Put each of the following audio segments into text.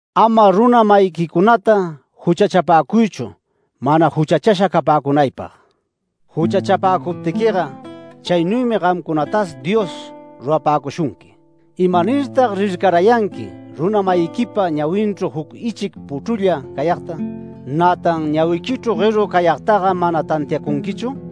“Ama runa-mayiquicunata juchachapäcuychu mana juchachasha capäcunaypag. Juchachapäcuptiquiga, chaynuymi gamcunatas Dios rurapäcushunqui. ¿Imanirtag rircarayanqui runa-mayiquipa ñawinchru juc ichic puchrula cayagta, nätan ñawiquichru gueru cayagtaga mana tantiacunquichu?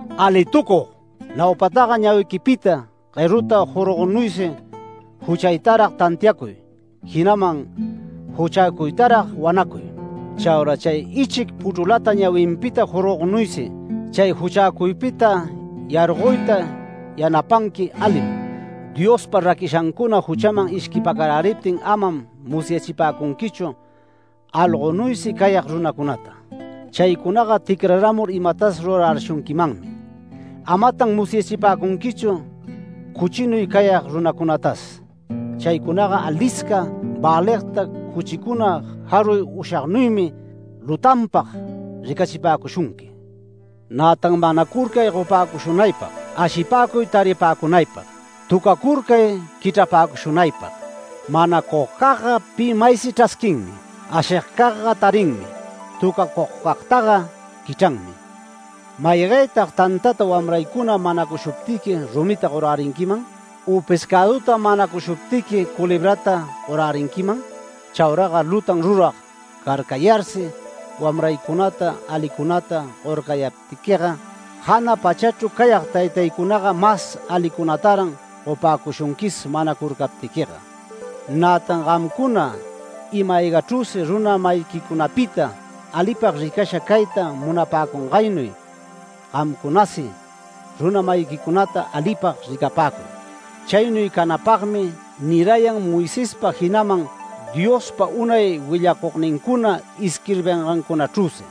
¡Alitucug! Naupataga ñawiquipita gueruta jorgognuysi juchaytarag tantiacuy, jinaman juchäcuytarag wanacuy. Chaura chay ichic puchrulata ñawinpita jorgognuysi, chay juchäcuypita yargoyta yanapanqui alim. Diospa raquishancuna juchaman ishquipacaräriptin amam musyachipäcunquichu algonuysi cayag runacunata, chaycunaga ticrarämur imatas rurarärishunquimanmi. Amatan musyachipäcunquichu cuchinuy cayag runacunatas. Chaycunaga alisca väligta cuchicuna jaruy ushagnuymi lutanpag ricachipäcushunqui. Nätan manacurcay gopäcushunaypag. Ashipäcuy taripäcunaypag. Töcacurcay quichrapäcushunaypag. Manacugcagga pi maysi chrasquinmi. Ashigcagga tarinmi. Töcacugcagtaga quichranmi. ¿Maygaytag tantata wamraycuna manacushuptiqui rumita gorärinquiman? U ¿pescäduta manacushuptiqui culebrata gorärinquiman? Chauraga lutan rurag carcayarsi wamraycunata alicunata gorcayaptiquiga, jana pachachru cayag Taytaycunaga mas alicunataran gopäcushunquis manacurcaptiquiga. Nätan gamcuna ima-aygachrüsi runa-mayiquicunapita alipag ricasha cayta munapäcungaynuy, gamcunasi runa-mayiquicunata alipag ricapäcuy. Chaynuy canäpagmi nirayan Moisespa jinaman Diospa unay willacugnincuna isquirbingancunachrüsi”.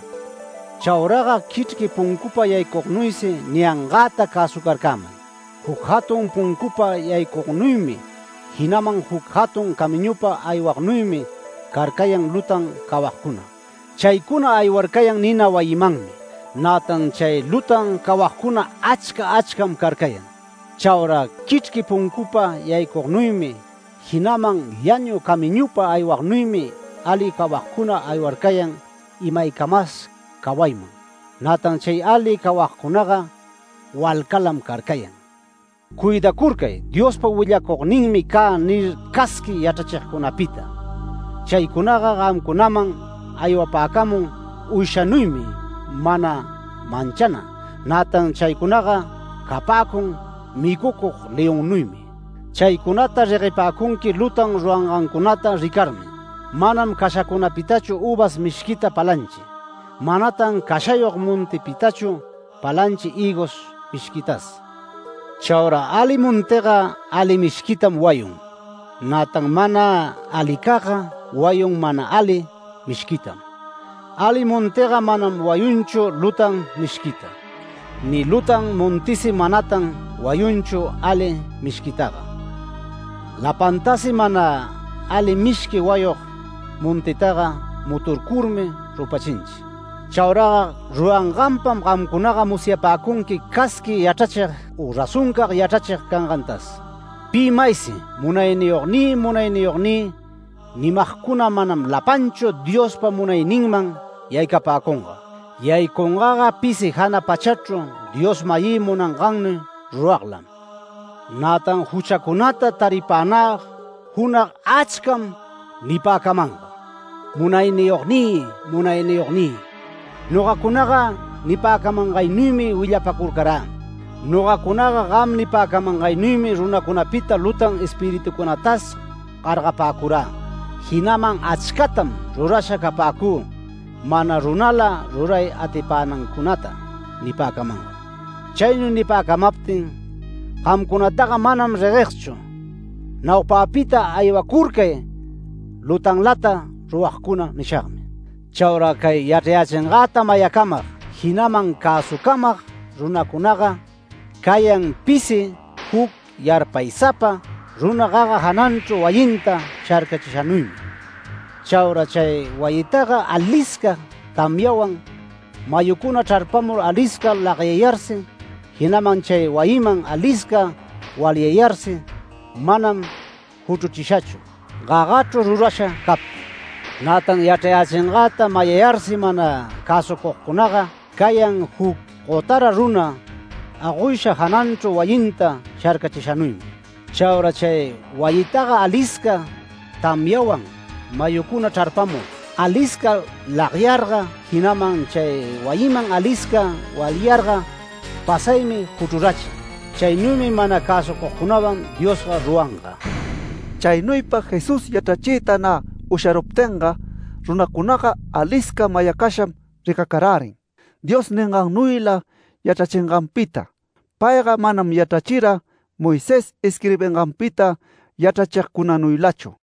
“Chauraga quichrqui puncupa yaycugnuysi niyangäta cäsucarcämay. Juc jatun puncupa yaycugnuymi jinaman juc jatun camiñupa aywagnuymi carcayan lutan cawagcuna. Chaycuna aywarcayan nina wayimanmi, nätan chay lutan cawagcuna achca achcam carcayan. Chaura quichrqui puncupa yaycugnuymi jinaman llanu camiñupa aywagnuymi ali cawagcuna aywarcayan imaycamas cawayman. Nätan chay ali cawagcunaga walcalam carcayan. Cuidacurcay ‘Diospa willacugninmi cä’ nir casqui yachrachigcunapita. Chaycunaga gamcunaman aywapäcamun uyshanuymi mana manchana, nätan chaycunaga capäcun micucug leonnuymi. Chaycunata reguepäcunqui lutan rurangancunata ricarmi. Manam cashacunapitachu üvas mishquita palanchi. Manatan cashayog montipitachu palanchi hïgos mishquitas. Chaura ali montiga ali mishquitam wayun, nätan mana alicagga wayun mana ali mishquitam. Ali montiga manam wayunchu lutan mishquita, ni lutan montisi manatan wayunchu ali mishquitaga. Lapantasi mana ali mishqui wayug montitaga muturcurmi rupachinchi. Chauraga ruranganpam gamcunaga musyapäcunqui casqui yachrachig u razoncag yachrachig cangantas. Pi maysi ‘Munayniyognï, Munayniyognï’ nimagcuna manam lapanchu Diospa munayninman yaycapäcunga. Yaycungaga pisi jana pachachru Dios-mayï munangannuy ruraglam. Nätan juchacunata taripänä junag achcam nipäcamanga: ‘Munayniyognï, Munayniyognï, nogacunaga nipäcamangaynuymi willapacurcarä. Nogacunaga gam nipäcamangaynuymi runacunapita lutan espiritucunatas gargapäcurä. Jinaman achcatam rurasha capäcü mana runala ruray atipänancunata’ nipäcamanga. Chaynuy nipäcamaptin: ‘Gamcunataga manam reguegchu. Naupäpita aywacurcay lutanlata ruragcuna’ nishagmi”. “Chauraga cay yachrayächingäta mayacamag jinaman cäsucamag runacunaga cayan pisi juc yarpaysapa runa gaga jananchru wayinta sharcachishanuymi. Chaura chay wayitaga alisca tamyawan, mayucuna chrarpamur alisca lagyayarsi, jinaman chay wayiman alisca walyayarsi manam juchruchishachu, gagachru rurasha captin. Nätan yachrayächingäta mayayarsi mana cäsucugcunaga cayan juc gotara runa agoysha jananchru wayinta sharcachishanuymi. Chaura chay wayitaga alisca tamyawan mayucuna chrarpamur, alisca lagyarga, jinaman chay wayiman alisca walyarga pasaymi juchrurachin. Chaynuymi mana cäsucugcunawan Dios ruracanga”. Chaynuypa Jesús yachrachiyta nä usharuptinga, runacunaga alisca mayacasham ricacarärin Dios ningannuyla yachrachinganpita. Payga manam yachrachira Moisés isquirbinganpita yachrachigcunanuylachu.